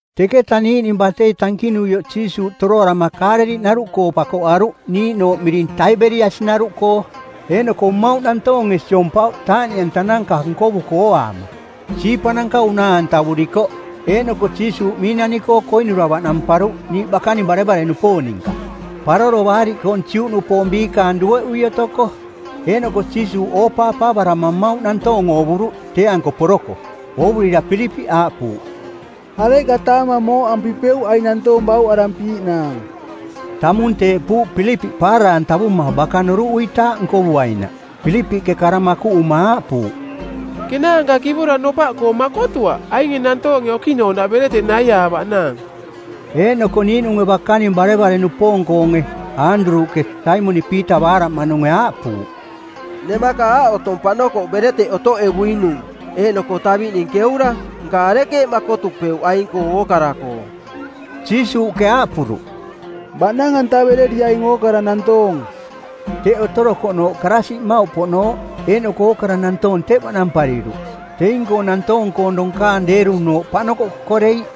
Teketa niiꞌning batei tankinuioꞌ Jiisuuꞌ toroarama Kaaleliꞌnaruꞌkoo pakoꞌaruꞌ niiꞌnooꞌ miring Taiberiasi-naruꞌkoo. Eeꞌnoko mmauꞌ nantoonge siompauꞌ taaꞌniꞌantananka nkovuko ooaama. Siipananka unaa-antavurikoꞌ. Eeꞌnoko Jiisuuꞌ miinani-koo koinura baꞌnamparuꞌ niiꞌ bakaning barevare-nupoong ninka, Paroro Baariꞌkoong˜ Juꞌnupoong biikaang dueꞌui otoko. Eeꞌnoko Jiisuuꞌ ooꞌoopaavarama mmauꞌ nantoong oovuruꞌ tee-anko poroko. Oovurira Pilipiꞌ aaꞌpuuꞌ, “Areꞌka taamang mooꞌampipeuꞌ aing nantoong bauꞌarampiiꞌnaang?” Tamung teeꞌpuuꞌ Pilipiꞌ paara-antavuma baka noruꞌuitaaꞌ nkovuainaꞌ. Pilipiꞌke kara makuꞌuma aaꞌpuuꞌ, “Kenaanka kivora nopaꞌkoo makotuaꞌ ainge nantoonge okiꞌnooꞌnaꞌ bereteꞌ naiaavaꞌnaang.” Eeꞌnoko niiꞌnunge bakaning barevare-nupoong-koonge, Aanduruꞌke, Saimoniꞌ Piita baaraꞌmaꞌnunge aaꞌpuuꞌ, “Nemaka aꞌ otong paꞌnokoꞌ bereteꞌ otoꞌevuinung, eeꞌnoko taviꞌning keura. Nka arekeeꞌ makotupeuꞌ aing-koo ookara-koo?” Jiisuuꞌke aaꞌpuruꞌ, “Baꞌnang-antavereriaing ookara nantoong.” Teꞌ otorokoꞌnooꞌ karaasiꞌ mmauꞌpoꞌnooꞌ, eeꞌnoko ookara nantoong teꞌ baꞌnampariruꞌ. Teing-koong nantoong-koong donkaang deerunooꞌ paꞌnokoꞌ kokoreiꞌ.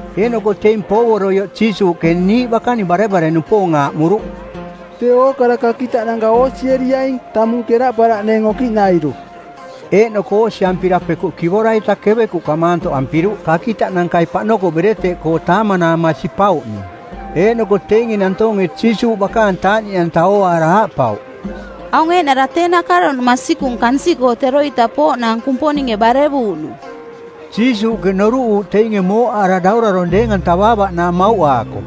Eeꞌnoko teing poovoroioꞌ Jiisuuꞌke niiꞌ bakaning barevare-nupoong aaꞌmuruꞌ, “Tee ookara kakitaꞌnanka oosieriaing, tamung keraꞌparaꞌneeng okiꞌnairu.” Eeꞌnoko oosiampira pekuꞌ kivora-ita kevekuꞌka maantoꞌampiruꞌ kakitaꞌnankai paꞌnokoꞌ bereteꞌkoo taamanaama sipauꞌning. Eeꞌnoko teinge nantoonge Jiisuuꞌ bakaang taaꞌniꞌanta ooaara aaꞌpauꞌ, “Aung eeꞌnara tee nakaronung masikung kansiꞌkoo teroita pooꞌnaang Kumponinge barevuuꞌnung.” Jiisuuꞌke noruꞌuuꞌ teinge mooꞌaara daurarong˜ deeng-antavaavaꞌnaang mauꞌaako.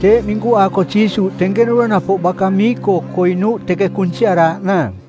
Teeꞌ minkuaako Jiisuuꞌ tenkenura napoꞌ baka mii-koo koinuuꞌ teka kunsiaraaꞌnaang.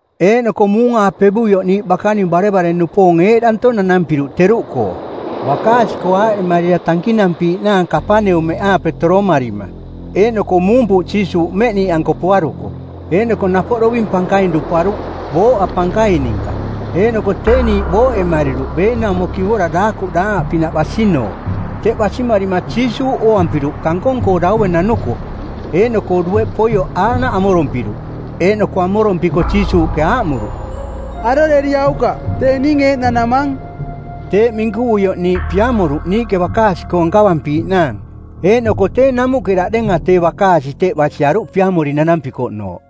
Eeꞌnoko muung-aapevuioꞌ niiꞌ bakaning barevare-nupoong eeꞌdanto nanampiruꞌ teruꞌkoo. Bakaasi-koo aaꞌemarira tankinampiiꞌnaang Kapaneumeꞌaape toromarima. Eeꞌnoko muumpuuꞌ Jiisuuꞌ mmeꞌ niiꞌanko poaruko. Eeꞌnoko napoꞌ doving pankaing duparuꞌ, booꞌa pankaing ninka. Eeꞌnoko tee niiꞌ booꞌemariruꞌ beenaumo kivora daakuꞌ daangaꞌpinaꞌ basinooꞌ. Teꞌ basimarima Jiisuuꞌ ooampiruꞌ kankong-koo daue nanuko, eeꞌnoko dueꞌ poioꞌ aaꞌnaꞌ amorompiruꞌ. Eeꞌnoko amorompiko Jiisuuꞌke aaꞌmuruꞌ, “Aroreriaukaꞌ. Tee ning eeꞌ nanamang.” Teeꞌ minkuvuioꞌ niiꞌ piamoruꞌ niiꞌke bakaasi-koo nkavampiiꞌnaang. Eeꞌnoko tee namuꞌke daꞌdenga tee bakaasi teꞌ basiaruꞌ piamori nanampikoꞌnooꞌ.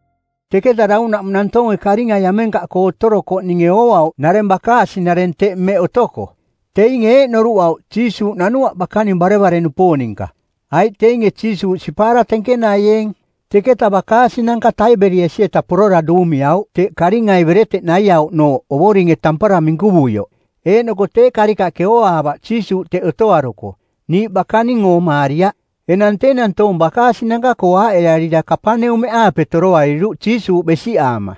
Teketa daunaꞌmung nantoonge karingai amenkaꞌkoo otorokoꞌninge ooauꞌ nareng bakaasi-nareng teꞌ mmeꞌ otoko. Teinge eeꞌ noruꞌauꞌ: Jiisuuꞌ nanuaꞌ bakaning barevare-nupoong ninka, aiꞌ teinge Jiisuuꞌ sipaara tenkenaieeng. Teketa bakaasinanka Taiberiasi-eta porora duumiauꞌ teꞌ karingai bereteꞌ naiauꞌnooꞌ Ovoringe tampara minkuvuioꞌ. Eeꞌnoko tee karikaꞌke ooaavaꞌ Jiisuuꞌ teꞌ otoaruko. Niiꞌ bakaning oomaariaꞌ. Enang tee nantoong bakaasinanka-koo aaꞌearira Kapaneumeꞌaape toroariruꞌ Jiisuuꞌ besiꞌaama.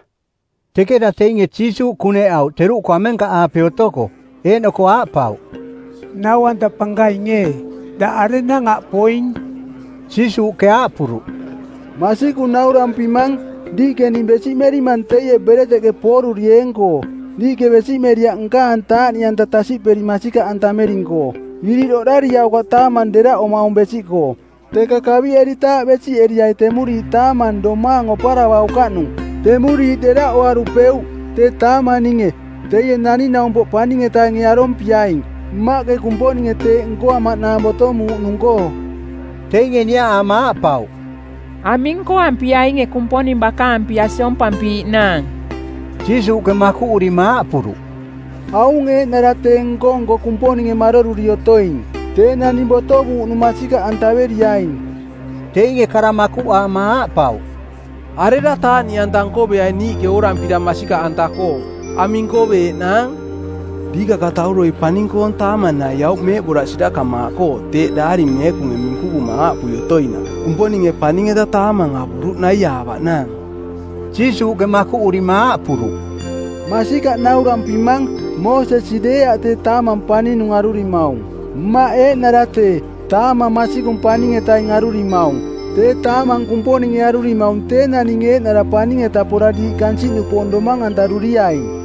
Teketa teinge Jiisuuꞌ kuneꞌauꞌ teruꞌkoo amenkaꞌaape otoko eeꞌnoko aaꞌpauꞌ, “Nau-anta Pankaing ee, daꞌ arenang aꞌ poing?” Jiisuuꞌke aaꞌpuruꞌ, “Masikung naurampimang, diiꞌke ning besiꞌmerimang teie bereteꞌke poorurieeng-koo. Diiꞌke besiꞌmeriaꞌ nkaang taaꞌniꞌanta tasiꞌperi masikaꞌantamering-koo. Iriꞌ oꞌdariaukaꞌ taamang deraꞌomaung besiꞌkoo. Teka kaviꞌeritaaꞌ besiꞌeriai temuriiꞌ taamang domaang oparavaukaꞌnung. Temuriiꞌ deraꞌoarupeuꞌ. Tee taamang ninge, teie Naning-naumpoꞌ Paning-etainge arompiaing, Mmaꞌke Kumponinge teeꞌ nkoamaꞌnaang botomuuꞌnung-koo.” Teinge niaꞌaama aaꞌpauꞌ, “Aming nkoampiainge Kumponing bakaang pia siompampiiꞌnaang?” Jiisuuꞌke makuꞌurima aaꞌpuruꞌ, “Aung eeꞌnara tee nko-nko Kumponinge maroruri otoing: Tee naning botovuuꞌnung masikaꞌantaveriaing.” Teinge kara makuꞌaama aaꞌpauꞌ, “Arera taaꞌniꞌanta nkoveaing niiꞌke oorampira masikaꞌanta-koo? Aming nkoveeꞌnaang? Diikakatauroi paning-koong taamang naiauꞌ meeꞌboraꞌ sirakamaaꞌkoo teeꞌ eeꞌnaꞌ Daari Meekunge minkuvuma aaꞌpui otoinaꞌ, ‘Kumponinge paning-eta taamang avuruꞌ naiaavaꞌnaang.’” Jiisuuꞌke makuꞌurima aaꞌpuruꞌ, “Masikaꞌ naurampimang, Moosesi deeaꞌ tee taamang paninung arurimaung. Mmaꞌ eeꞌnara tee, taamang masikung paning-etaing arurimaung. Tee taamang Kumponinge arurimaung tee naning eeꞌnara paning-eta pora diiꞌ kansiꞌnupoong domang-antaruriaing.”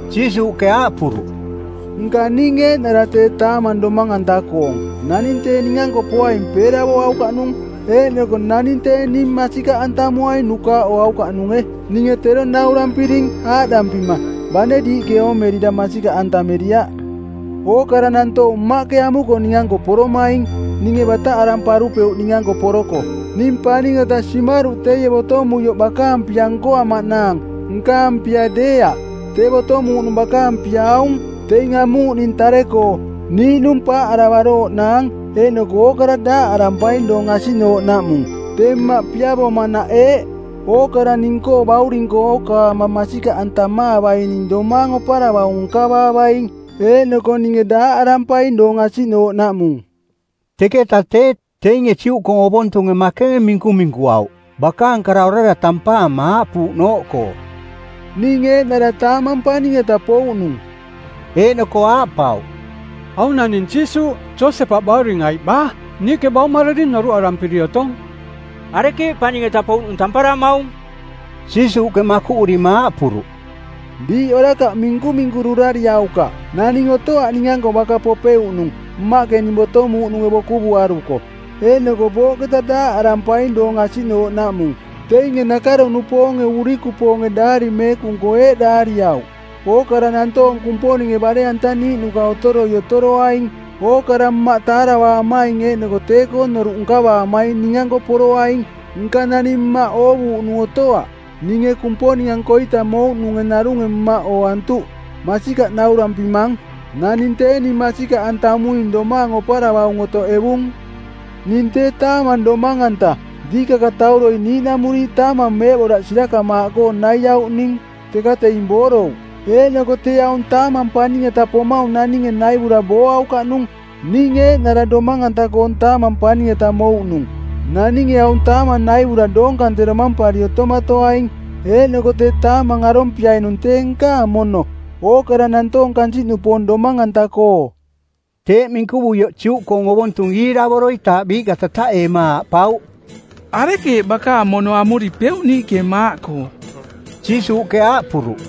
Jiisuuꞌke aaꞌpuruꞌ, “Nka ning eeꞌnara tee taamang domang-anta-koong. Naning tee ning-anko poaing peeravoaukaꞌnung, eeꞌnoko naning tee ning masikaꞌantamuaing nukaaꞌoaukaꞌnunge. “Ninge tero naurampiring, aaꞌdampima, bane diiꞌke oomerira masikaꞌantameriaꞌ. Ookara nantoong Mmaꞌke amuko ning-anko poromaing. Ninge bataꞌaramparupeuꞌ ning-anko poroko. Ning paning-eta simaruꞌ teie botomuioꞌ bakaang pia nkoamaꞌnaang, nkaang pia deeaꞌ. Tee botomuuꞌnung bakaang pia aung: teing amuuꞌning tare-koo, niiꞌnung paaꞌaravarooꞌnaang, eeꞌnoko ookara daaꞌarampaing doong asiꞌnooꞌnaꞌmung. Tee Mmaꞌ piavomanaꞌ eeꞌ: ookara ning-koo Bauring-koo ookaama masikaꞌantamaavaining domaang oparavaung nkavaavaing. Eeꞌnoko ninge daaꞌarampaing doong asiꞌnooꞌnaꞌmung.” Teketa tee, teinge Juꞌkoong ovontunge makenge minkuminkuauꞌ, bakaang kara orara tampaama aaꞌpuuꞌnooꞌkoo, “Ning eeꞌnara taamang paning-eta pouꞌnung.” Eeꞌnoko aaꞌpauꞌ, “Aung naning Jiisuuꞌ, Josepaꞌ bauring aiꞌ baa? Niiꞌke baumararing noruꞌarampiri otong. Arekeeꞌ paning-eta pouꞌnung tamparamaung?” Jiisuuꞌke makuꞌurima aaꞌpuruꞌ, “Diiꞌ orakaꞌ minkuminkururariaukaꞌ. Naning otoaꞌ ning-anko baka popeuꞌnung, Mmaꞌke ning botomuuꞌnunge bokuvuaruko. Eeꞌnoko booꞌketa daaꞌantavampaing doong asiꞌnooꞌnaꞌmung. Teinge nakaro-nupoonge urikupoonge Daari Meekung-koo eeꞌ daariauꞌ, ‘Ookara nantoong Kumponinge bare-antaniiꞌnuka otoroi otoroaing.’ Ookara Mmaꞌ taaravaamaing eeꞌnoko tee-koo noruꞌ nkavaamaing ning-anko poroaing. Nka naning Mmaꞌ oovuuꞌnung otoaꞌ. Ninge Kumponing-ankoita mouꞌnunge narunge Mmaꞌ ooantuꞌ. “Masikaꞌ naurampimang, naning tee ning masikaꞌantamuing domaang oparavaung otoꞌevung. Ning tee taamang domang-anta. Diikakatauroi niiꞌnamuriiꞌ taamang meeꞌboraꞌ sirakamaaꞌkoo naiauꞌning, teka teing boorouꞌ. Eeꞌnoko tee aung taamang paning-eta pomaung naninge naivura booaukaꞌnung. Ning eeꞌnara domang-anta-koong taamang paning-eta mouꞌnung. Naninge aung taamang naivura doong kante domampari otomatoaing, eeꞌnoko tee taamang arompiainung tee nkaang mono, ookara nantoong kansiꞌnupoong domang-anta-koo.” Teeꞌ minkuvuioꞌ Juꞌkoong ovontung iiravoroitaaꞌ biiꞌka tataꞌeema aaꞌpauꞌ, “Arekeeꞌ bakaang mono amuripeuꞌ niiꞌke maaꞌkoo?” Jiisuuꞌke aaꞌpuruꞌ,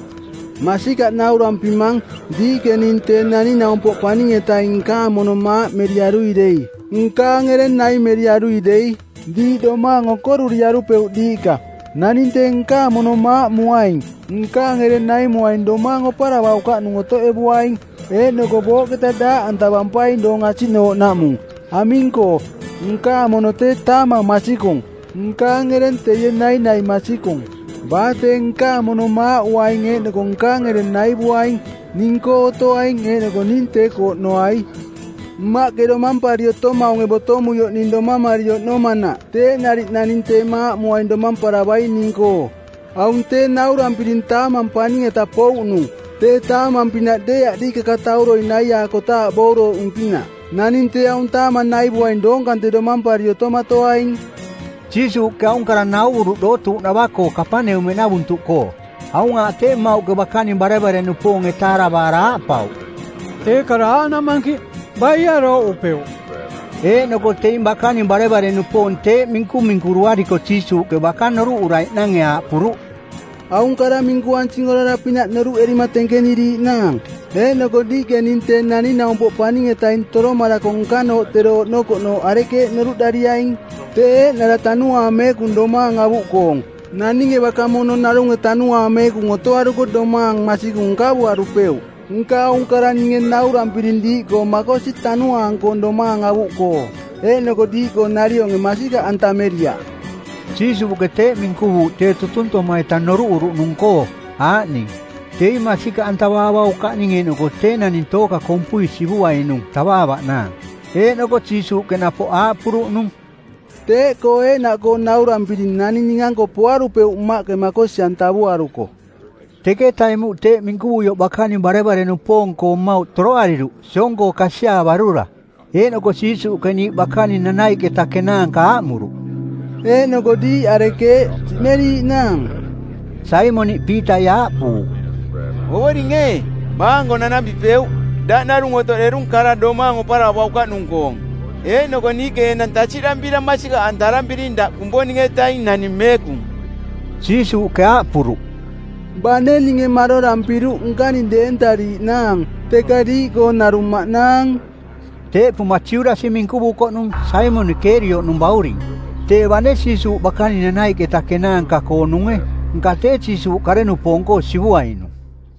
“Masikaꞌ naurampimang, diiꞌke ning Tee Naning-naumpoꞌ Paning-etaing nkaang mono maaꞌmeriarui dei, nkaang ereng naimeriarui dei, diiꞌ domaang okoruriarupeuꞌ diiꞌka. Naning tee nkaang mono maaꞌmuaing, nkaang ereng naimuaing domaang oparavaukaꞌnung otoꞌevuaing, eeꞌnoko booꞌketa daaꞌantavampaing doong asiꞌnooꞌnaꞌmung. Aming-koo, nkaang mono tee taamang masikung, nkaang ereng teie nainai masikung. Baa tee nkaang mono maaꞌuaing eeꞌnoko nkaang ereng naivuaing, ning-koo otoaing eeꞌnoko ning tee-koo oꞌnoai. Mmaꞌke domampari otomaunge botomuioꞌ ning domamari oꞌnomanaꞌ teeꞌ nariꞌ naning tee maaꞌmuaing domamparavaing ning-koo. Aung tee naurampiring taamang paning-eta pouꞌnung. Tee taamang-pinaꞌ deeaꞌ diikakatauroi naiaakotaaꞌ boorouꞌnung-pinaꞌ. Naning tee aung taamang naivuaing doong kante domampari otomatoaing.” Jiisuuꞌke aung kara nauvuruꞌ dootuuꞌnava-koo Kapaneumeꞌnavuntuꞌkoo. Aung aaꞌ tee, mmauꞌke bakaning barevare-nupoonge taaravaara aaꞌpauꞌ, “Tee kara aaꞌnaꞌ mankiꞌ. Baie arooꞌupeuꞌ?” Eeꞌnoko teing bakaning barevare-nupoong teeꞌ minkuminkuruariko Jiisuuꞌke baka noruꞌuraiꞌnange aaꞌpuruꞌ, “Aung kara minkuansing orara-pinaꞌ noruꞌerima tenkeniriiꞌnaang? Eeꞌnoko diiꞌke ning Tee Naning-naumpoꞌ Paning-etaing toromarako nkanooꞌ tero oꞌnokoꞌnooꞌ arekeeꞌ noruꞌdariaing? Tee eeꞌnara Tanuaang Meekung domaang avuꞌkoong. Naninge baka mono narunge Tanuaang Meekung otoaruko domaang masikung nkavuarupeuꞌ. Nka aung kara ninge naurampiring diiꞌkoo makosi tanuaang-koong domaang avuꞌkoo. Eeꞌnoko diiꞌkoo narionge masikaꞌantameriaꞌ.” Jiisuuꞌke teeꞌ minkuvuuꞌ tee tutuntoma-ita noruꞌuruꞌnung-koo, aaꞌning: teing masikaꞌantavaavaukaꞌning eeꞌnoko tee naning tooka kompui sivuainung tavaavaꞌnaang. Eeꞌnoko Jiisuuꞌke napoꞌ aaꞌpuruꞌnung, “Teeꞌkoo eeꞌnaꞌkoo naurampiring naning ning-anko poarupeuꞌ Mmaꞌke makosi-antavuaruko.” Teketa emuꞌ teeꞌ minkuvuioꞌ bakaning barevare-nupoong-koo mmauꞌ toroariruꞌ, siong-koo kasiaavarura. Eeꞌnoko Jiisuuꞌke niiꞌ bakaning nanaiꞌketa kenaanka aaꞌmuruꞌ, “Eeꞌnoko diiꞌ arekeeꞌ, siꞌmeriiꞌnaang?” Saimoniꞌ Piitai aaꞌpuuꞌ, “Ovoring ee, baa-anko nanampipeuꞌ? Daꞌ narung otoꞌderung kara domaang oparavaukaꞌnung-koong. Eeꞌnoko niiꞌke enang tasiꞌdampira masikaꞌantarampiring, daꞌ Kumponing-etaing Naning Meekung.” Jiisuuꞌke aaꞌpuruꞌ, “Bane ninge marorampiruꞌ nkaning deentariiꞌnaang, teka diiꞌkoong narung maꞌnaang.” Teeꞌpuma Judasi minkuvukoꞌnung, Saimoniꞌ Kerioꞌnung bauring. Tee, bane Jiisuuꞌ bakaning nanaiꞌketa kenaanka-koonunge, nka tee Jiisuuꞌ kare-nupoong-koo sivuainung.